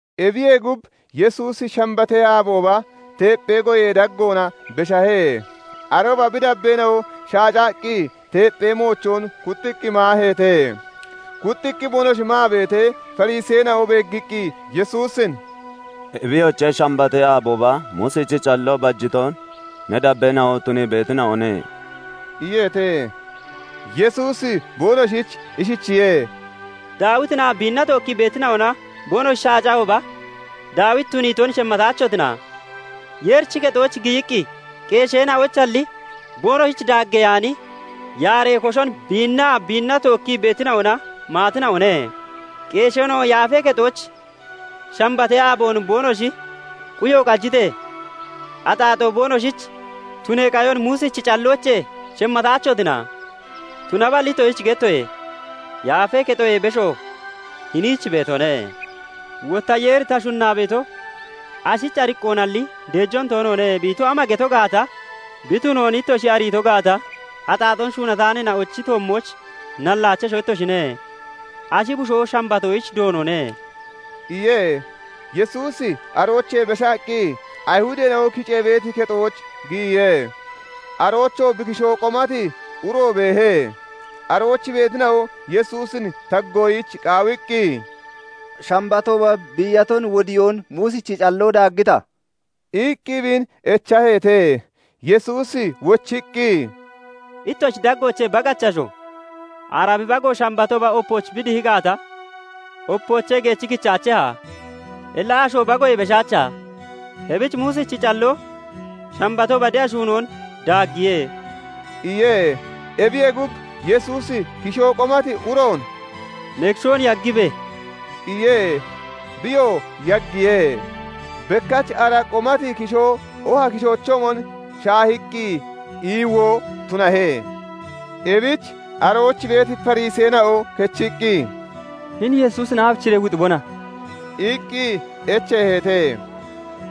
Ebiyee gub, Yesuusi Shambatee aabooba teepphee goyee daggoona beshahe. Arooba bi dabbeena'o shaacaqqi teepphee moochoon kuxxiqqi maaheete. Kuxxiqqi boonoshi maa beetee, Fariseena'o beeggiqqi Yesuusin "Ebiyoche! Shambatee aabooba Muusichi calloo bajiton ne dabbeena'o tunii beetina'one' iyeete. Yesuusi boonoshich ishichiye:- "Daawitinaa biinna tookkii beetina'ona boonoshi shaacahooba Daawiti tuniiton shemmataachotina? Yeerichi kexooch giyiqqi qeesheena'oyichalli boonoshich daageyaani yaaree koshon biinnaa biinna tookkii beetina'ona maatina'one. Qeesheena'o yaafee kexooch Shambatee aaboon boonoshi quyo qajitee, axaaxoo boonoshich tunee qayon Muusichi calloochee shemmataachotina? Tunaballi ittoshich gettoye; Yaafee Kexoyee besho hiniich beetone. Wotta Yeeri 'Ta shunnaa beeto, ashich ariqqoonalli deejoon toonoone' bi ito ama geto gaata bi tunoon ittoshi ariito gaata, axaaxoon shuunataaneena'ochi toommooch nallaachesho ittoshine. Ashi bushoo Shambatoyich Doonone" iye. Yesuusi aroochee beshaqqi Ayihudeena'o kicee beeti kexooch giyiye. Aroochoo bi kishoo qomati uro beehe. Arooch beetina'o Yesuusin taggoyich qaawiqqi, "Shambatooba biiyaton wodiyoon Muusichi calloo daaggita?" iqqi biin echaheete. Yesuusi wochiqqi, "Ittoshi daggoochee bagachi asho, ara bi bago Shambatooba opooch bi dihi gaata, opoochee geechi kichaacheha? Illa asho bagoyee beshaacha? Ebich Muusichi calloo Shambatooba de'a shuunoon daaggiye" iye. Ebiyee gub, Yesuusi kishoo qomati uroon "Ne kishoon yaggibe!" iye. Biyoo yaggiye; bekkach ara qomati kishoo oha kishoochoomon shaahiqqi iiwoo tunahe. Ebich arooch beeti Fariseena'o kechiqqi, "Hini Yesuusin aabichiree wuxibona?" iqqi echeeheete.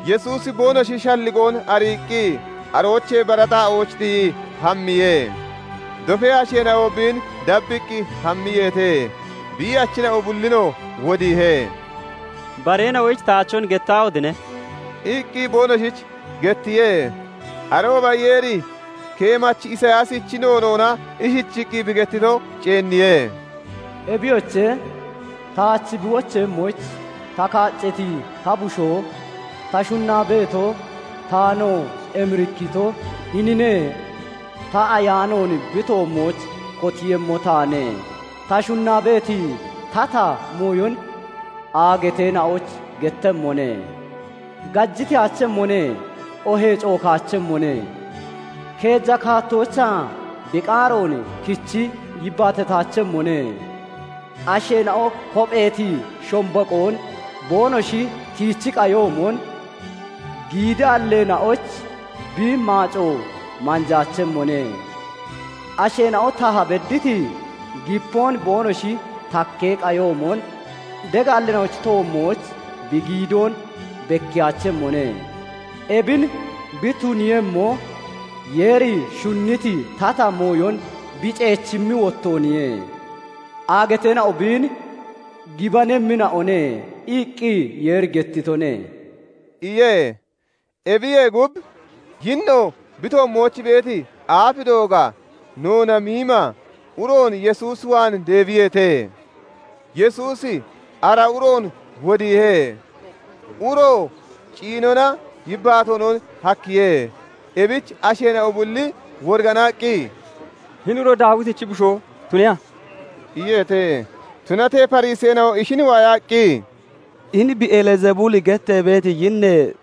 Yesuusi boonoshi shalligoon ariiqqi aroochee bara xaa'ooch tiyii hammiye. Dofee asheena'o biin dabbiqqi hammiyeete; biiyachina'o bullinoo wodiihe. "Bareena'oyich taachon gettaahotine!" iqqi boonoshich gettiye. Arooba Yeeri keemachi Isiyaasichi noonoona ishichiqqi bi gettito ceenniye; " 'Ebiyoche! Taach bi wocheeyemmoyich ta kaaccati ta bushoo, ta shunnaa beeto, taanoo emirikkito hinine! Ta Ayaanoon bi toommooch kotiiyemmo taane; ta shunnaa beeti tata mooyon aagateena'oyich gettemmone. Gajiteyaachemmone; oohee cookaachemmone; keeja kaattoochaa bi qaaroon kichi yibbaatataachemmone; asheena'o kopheeti shombaqoon boonoshi tiichi qayoomon giidaalleena'oyich bi maaco manjaachemmone. Asheena'o taha bedditi gipoon boonoshi takkee qayoomon degaalleena'ochi toommooch bi giidoon bekkiyaachemmone. Ebin bi tuniiyemmo, Yeeri shunniti tata mooyon bi ceechimmi wottooniye. Aagateena'o biin gibanemmina'one' iqqi Yeeri gettitone" iye. Ebiyee gub, yinno bi toommooch beeti aaf dooga, noona miima uroon Yesuus waan deebiyeete. Yesuusi ara uroon wodiihe; uroo ciinonaa yibbaatoonon hakkiye. Ebich asheena'o bulli woriganaqqi, "Hini uro Daawitichi bushoo tuneha?" iyeete. Tunatee Fariseena'o ishin waayaqqi, "Hini beelzebuli gettee beeti yinnee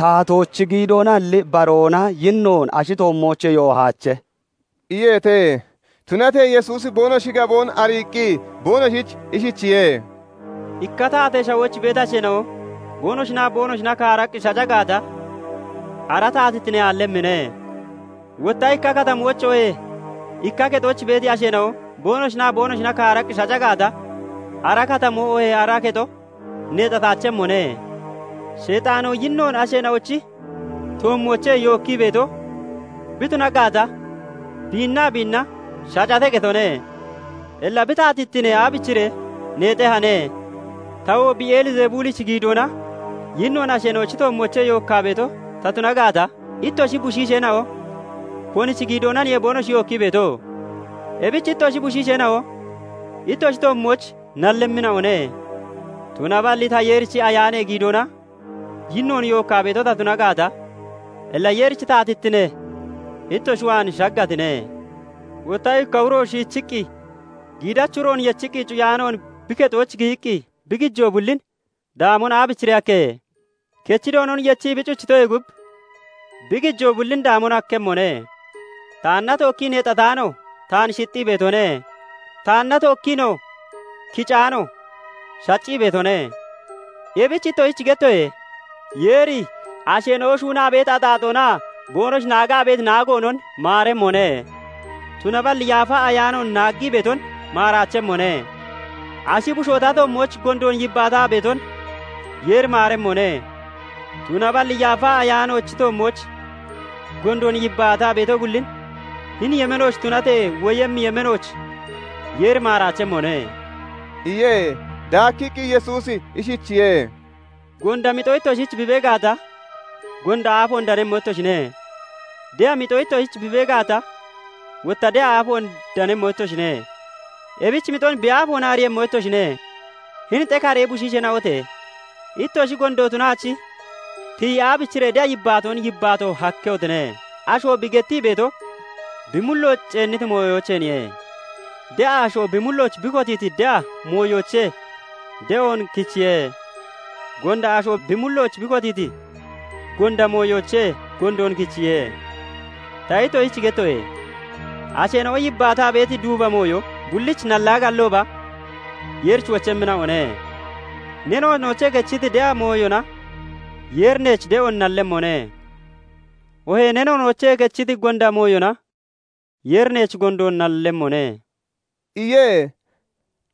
taatoochi giidoonalli baroona yinnoon ashi toommoochee yoohache" iyeete. Tunatee Yesuusi boonoshi gaboon ariiqqi boonoshich ishichiye:- "Ikka taatee shawooch beeti asheena'o boonoshinaa boonoshina kaaraqqi shaca gaata, ara taatittine aallemmine. Wotta ikka katamooch oohee ikka kexooch beeti asheena'o boonoshinaa boonoshina kaaraqqi shaca gaata, ara katamoo oohee ara kexo neexataachemmone. sheexaanoo yinnoon asheena'ochi toommoochee yookkii beeto bi tuna gaata, biinnaa biinna shacate getone. Illa bi taatittine aabichiree neexehane? Tawoo beelzebulichi giidoona yinnoon asheena'ochi toommoochee yookkaa beeto ta tuna gaata, ittoshi bushiisheena'o konichi giidoonaniye boonoshi yookkii beeto? Ebich ittoshi bushiisheena'o ittoshi toommooch nallemmina'one. Tunaballi ta Yeerichi Ayaanee giidoona yinnoon yookkaa beeto ta tuna gaata, illa Yeerichi taatittine ittoshi waan shaggatine. "Wotta ikka uro shiichiqqi giidachi uroon yechii cuyaanoon bi kexooch giyiqqi bi gijoo bullin daamon aabichiree hakkehe? Kechi Doonon yechii bi cuchitoyee gub, bi gijoo bullin daamon hakkemmone. Taanna tookkii neexataano taan shixxii beetone; taanna tookkiinoo kicaano shaccii beetone. Ebich ittoshich gettoye; Yeeri asheena'o shuunaa beeti axaaxoonaa boonoshi naagaa beeti naagoonon maaremmone; tunaballi Yaafa Ayaanoon naaggii beeton maaraachemmone. Ashi bushoo ta toommooch gondoon yibbaataa beeton Yeeri maaremmone; tunaballi Yaafa Ayaanoochi toommooch gondoon yibbaataa beeto bullin hini yemeenooch tunatee, woyemmi yemeenooch Yeeri maaraachemmone" iye. Daakkiqqi Yesuusi ishichiye:- "Gonda mixo ittoshich bi bee gaata, gonda aafoon danemmo ittoshine; de'a mixo ittoshich bi bee gaata, wotta de'a aafoon danemmo ittoshine. Ebich mixon bi aafoona ariiyemmo ittoshine. Hini xekaree bushiisheena'ote! Ittoshi gondo tunaachi tiyi aabichiree de'a yibbaatoon yibbaato hakkehotine? Asho bi gettii beeto bi mullooch ceenniti mooyoocheenniye. De'a asho bi mullooch bi kotiiti de'a mooyoochee de'oon kichiye. Gonda asho bi mullooch bi kotiiti gonda mooyoochee gondoon kichiye. Ta ittoshich gettoye; asheena'o yibbaataa beeti duuba mooyo bullich nallaa gallooba Yeerich wochemmina'one. Ne noonoochee kechiti de'a mooyona Yeeri neech de'oon nallemmone; oohee ne noonoochee kechiti gonda mooyona Yeeri neech gondoon nallemmone" iye.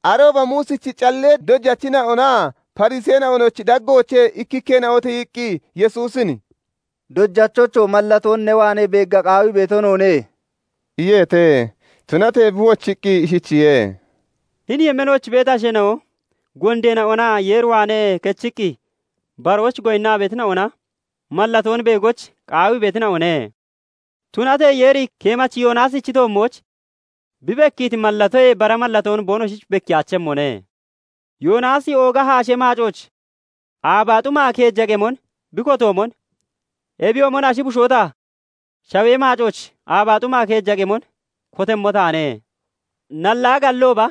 Arooba Muusichi callee dojachina'onaa Fariseena'onochi daggoochee ikkikkeena'o tiyiqqi Yesuusin "Dojachocho! mallatoon ne waanee beegga qaawii beeto noone" iyeete. Tunatee bi wochiqqi ishichiye:- "Hini yemeenooch beeti asheena'o gondeena'onaa Yeer waanee kechiqqi baroyich goyinnaa beetina'ona mallatoon beegoyich qaawii beetina'one; tunatee Yeeri keemachi Yoonaasichi toommooch bi bekkiiti mallatoyee bara mallatoon boonoshich bekkiyaachemmone. Yoonaasi ooga haashee maacooch aabaa xuma keeja qemon bi kotatoomon, ebiyoomon ashi bushoo ta shawee maacooch aabaa xuma keeja qemon kotemmo taane. Nallaa gallooba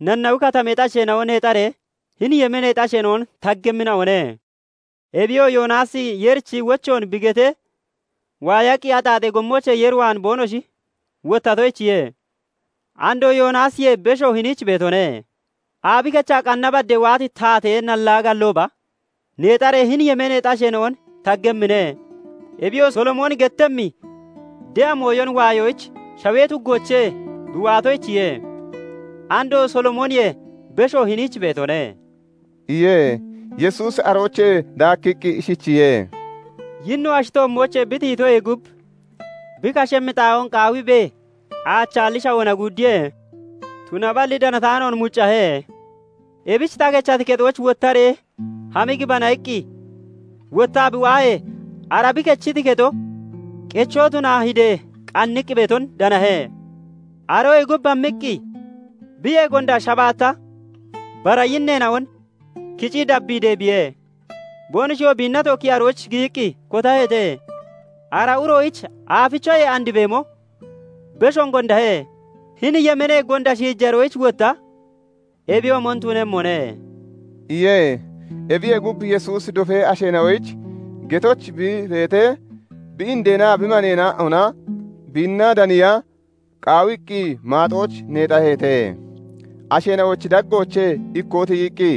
Nanawi Katameexi asheena'o neexaree hini yemeeneexi asheena'on taggemmina'one; Ebiyoo Yoonaasi Yeerichi wochoon bi gettee waayaqqi axaaxee gommoochee Yeer waan boonoshi wottatoyichiye. Andoo Yoonaasiyee besho hiniich beetone. Aabi kechaa qanna badee waati taatee nallaa gallooba neexaree hini yemeeneexi asheena'on taggemmine; Ebiyoo Solomooni gettemmi de'a mooyon waayoyich shawee tuggoochee bi waatoyichiye. Andoo Solomooniyee besho hiniich beetone" iye. Yesuusi aroochee daakkiqqi ishichiye:- "Yinno ashi toommoochee bi tiyitoyee gub, bi kashemmi xaa'oon qaawiibee aachaalli shawoona guuddiye; tunaballi danataanoon muccahe. Ebich 'Ta kechati kexooch wottaree hami gibana' iqqi wottaa bi waahee, ara bi kechiti kexo qechoo tunaa hidee qanniqqi beeton danahe. Aroyee gub, hammiqqi biyee gonda shabaatta bara yinneena'on kicii dabbii deebiye; boonoshiyoo biinna tookkii arooch giyiqqi kotaheete; ara uroyich aafichoyee andi beemo beshoon gondahe. Hini yemeenee gonda shiijaroyich wotta ebiyoomon tunemmone" iye. Ebiye gub, Yesuusi dofee asheena'oyich getooch bi beetee, bi indeenaa bi maneena'ona biinna daniya qaawiqqi maaxooch neexaheete. [Asheena'ochi daggoochee ikkoo tiyiqqi,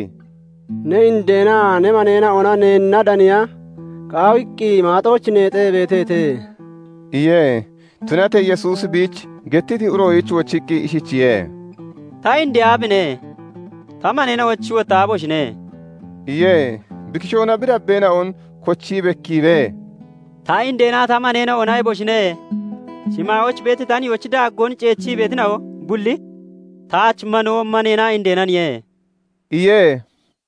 "Ne indeenaa ne maneena'ona neenna daniya qaawiqqi maaxooch neexaa beeteete" iye.] Tunatee Yesuusi biich gettiti uroyich wochiqqi ishichiye:- "Ta indee aabine? Ta maneena'ochi wotta aaboshine?" iye. Bi kishoona bi dabbeena'on kochii bekkiibee, "Ta indeenaa ta maneena'ona eboshine! Shimaayooch beeti ta nihoochi daaggoon ceechi beetina'o bulli taach manoo, maneenaa indeenaniye" iye.